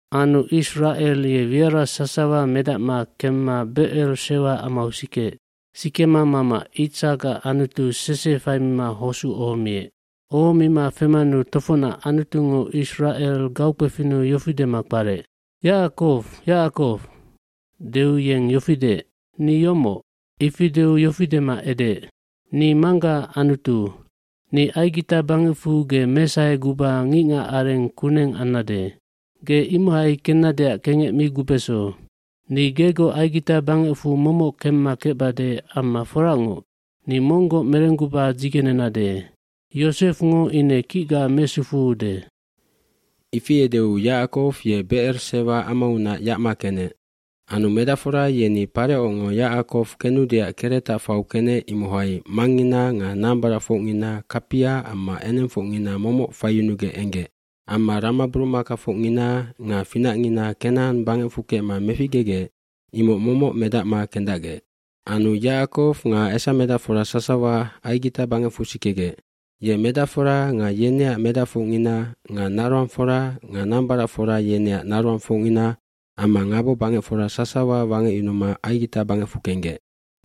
aAnu Isracel ye wiara sasawa medacma kemma Becer Sewa amau sikeec. Sikema mama Itsakac Anutu sese faimima hosuc ohomiec. bOhomima femanu tofocnac Anutungo Isracel gaukpefinnu yofi dema kparec, “Yacakow, Yacakow.” Deu yeng yofi deec, “Ni yomoc.” cIfi deu yofi dema edeec, “Ni manggaac Anutu. Ni Aigita bangecfu ge mesaheguba ngicngacareng kuneng ambesannec. Ge imohai kennadeac kengec mi gubeso. dNi gegoc Aigita bangecfu momoc kemma kecbade amma foracngoc, ni monggoc merengguba dzigenebesannec. Yosefngo ine kicga mesufuude.” Ifi edeu Yacakow ye Becer Sewa amaunac yacma kenec. Anu medacfora yeni Parecongo Yacakow kenudeac keretac fau kenec imohai mangngina nga nambaracfocngina kapia amma enengfocngina momoc faiyunugec enggec. eAmma ramaburumakafocngina nga finacngina Kenacan bangecfu kecma meficgegec imoc momoc medacma kendacgec. Anu Yacakow nga esamedacfora sasawa Aigita bangecfu sikegec. Ye medacfora nga yeneac medacfocngina nga naroangfora nga nambaracfora yeneac naroangfocngina amma ngabobangecfora sasawa wangecyunuma Aigita bangecfu kenggec.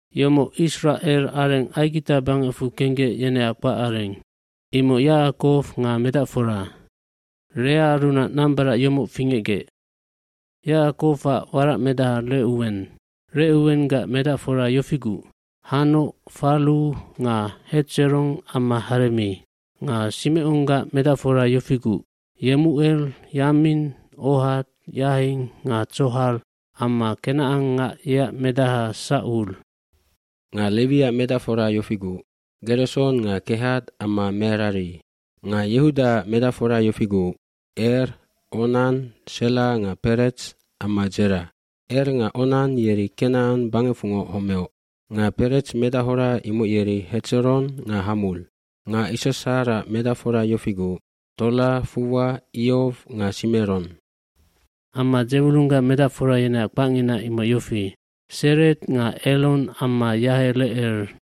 fYomoc Isracelac areng Aigita bangecfu kenggec yeneac kpacareng. Imoc Yacakow nga medacfora. Leaarunac nambarac yomoc fingecgec Yacakowac warac medaha Recuwen. Recuwenggac medacfora yofiguc, Hanoc, Fallu nga Hetseron amma Haremi. Nga Simeconggac medacfora yofiguc, Yemucel, Yamin, Ohad, Yahin nga Tsohar amma kenacangngac yeac medaha Sacul. Nga Lewiac medacfora yofiguc, Gereson nga Kehat amma Merari. Nga Yehudaac medacfora yofiguc, Er, Onan, Sela nga Perets amma Dzera. Er nga Onan yeri Kenacan bangecfungoc homeoc. Nga Perets medachora imoc yeri Hetseron nga Hamul. Nga Issasharac medacfora yofiguc, Tola, Fuwa, Iow nga Simeron. Amma Dzewulunggac medacfora yeneac kpacngina imoc yofi, Sered nga Elon amma Yahelecel.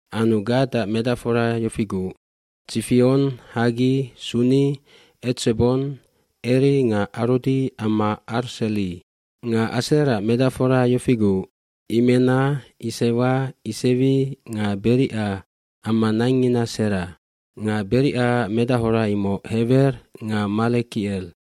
Anu Gadac medacfora yofiguc, Tsifion, Haggi, Suni, Etsebon, Eri nga Arodi amma Arseli. Nga Aserac medacfora yofiguc, Imena, Isewa, Isewi nga Berica amma naingngina Sera. Nga Bericaac medachora imoc Hewer nga Malekicel.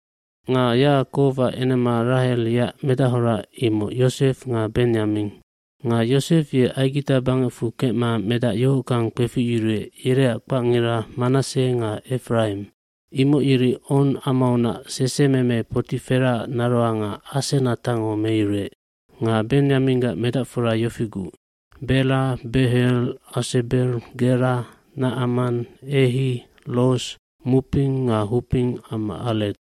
Nga Yacakowac enema Rahel yeac medachora imoc Yosef nga Benyamin. gNga Yosef ye Aigita bangecfu kecma medac yohockang kpeficyuruec yereac kpacngira Manasse nga Efraim. Imoc yeri On amaunac sesememe Poti Feraac naroanga Asenatango meyuruec. Nga Benyaminggac medacfora yofiguc, Bela, Beher, Asebel, Gera, Nacaman, Ehi, Ros, Muppim nga Huppim amma Ared.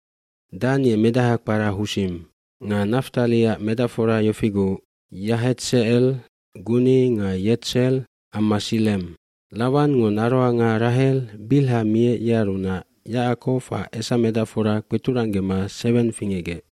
Dan ye medaha kpara Husim. Nga Naftaliac medacfora yofiguc, Yahetsecel, Guni nga Yetser amma Sillem. Lawangngo naroanga Rahel Bilha miec yearunac Yacakowac esamedacfora kpeturanggema seweng fingecgec.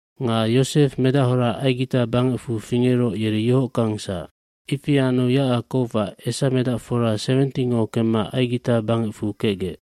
hNga Yosef medachora Aigita bangecfu fingeroc yeri yohockangsac. Ifi anu Yacakowac esamedacfora 70ngo kemma Aigita bangecfu kecgec.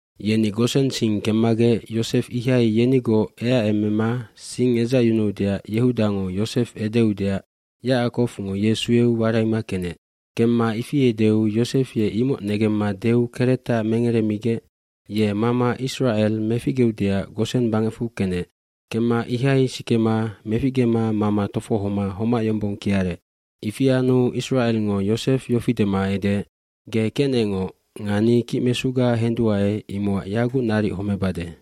Yeni Gosen sing kemmagec Yosef ihai yenigoc eacemema sing edzacyunuudeac Yehudango Yosef edeudeac Yacackowngo ye sueu waraima kenec. Kemma ifi edeu Yosef ye imoc negemma deu keretaha mengeremigec ye mama Isracel meficgeudeac Gosen bangecfu kenec. Kemma ihai sikema meficgema mama tofohoma homac yombong kiarec. Ifi anu Isracelngo Yosef yofi dema edeec, “Ge kecnecngoc nga ni kicmesuga henduae imocac yaguc naric homebade.”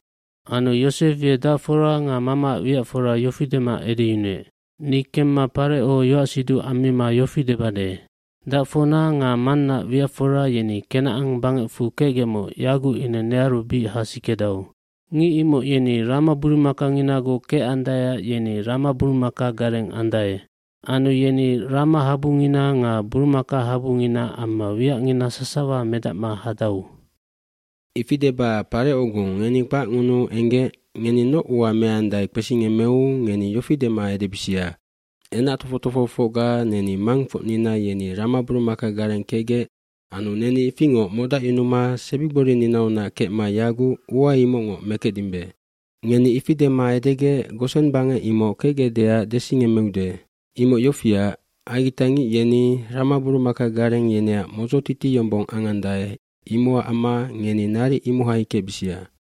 Anu Yosef ye dacfora nga mamaac wiacfora yofi dema edeyunuec, “Ni kemma Pareco yoacsiduc ammima yofi debade, ‘Dacfocna nga mannaac wiacfora yeni Kenacan bangecfu kecgecmoc yaguc ine nearu bic hasikedau. Ngic imoc yeni ramaburumakanginagoc kecandaeac yeni ramaburumakagareng andae. Anu yeni ramahabungina nga burumakahabungina amma wiacngina sasawa medacma hadau.’ Ifi deba Parecongo ngeni kpacngunuu enggec ngeni noc ua meandae kpesingemmeu ngeni yofi dema edebisia, ‘Enac tofoc tofohofocga neni mangfocnina yeni ramaburumakagareng kecgec anu neni ifingoc modacyunuma sebigborininaunac kecma yaguc ua imocngoc mekecdimbe.’ Ngeni ifi dema edegec Gosen bangec imoc kecgecdeac desingemmeude. Imoc yofiac, aigitangic yeni ramaburumakagareng yeneac modzotiti yombong angandae imocac amma ngeni naric imohai kecbisia.”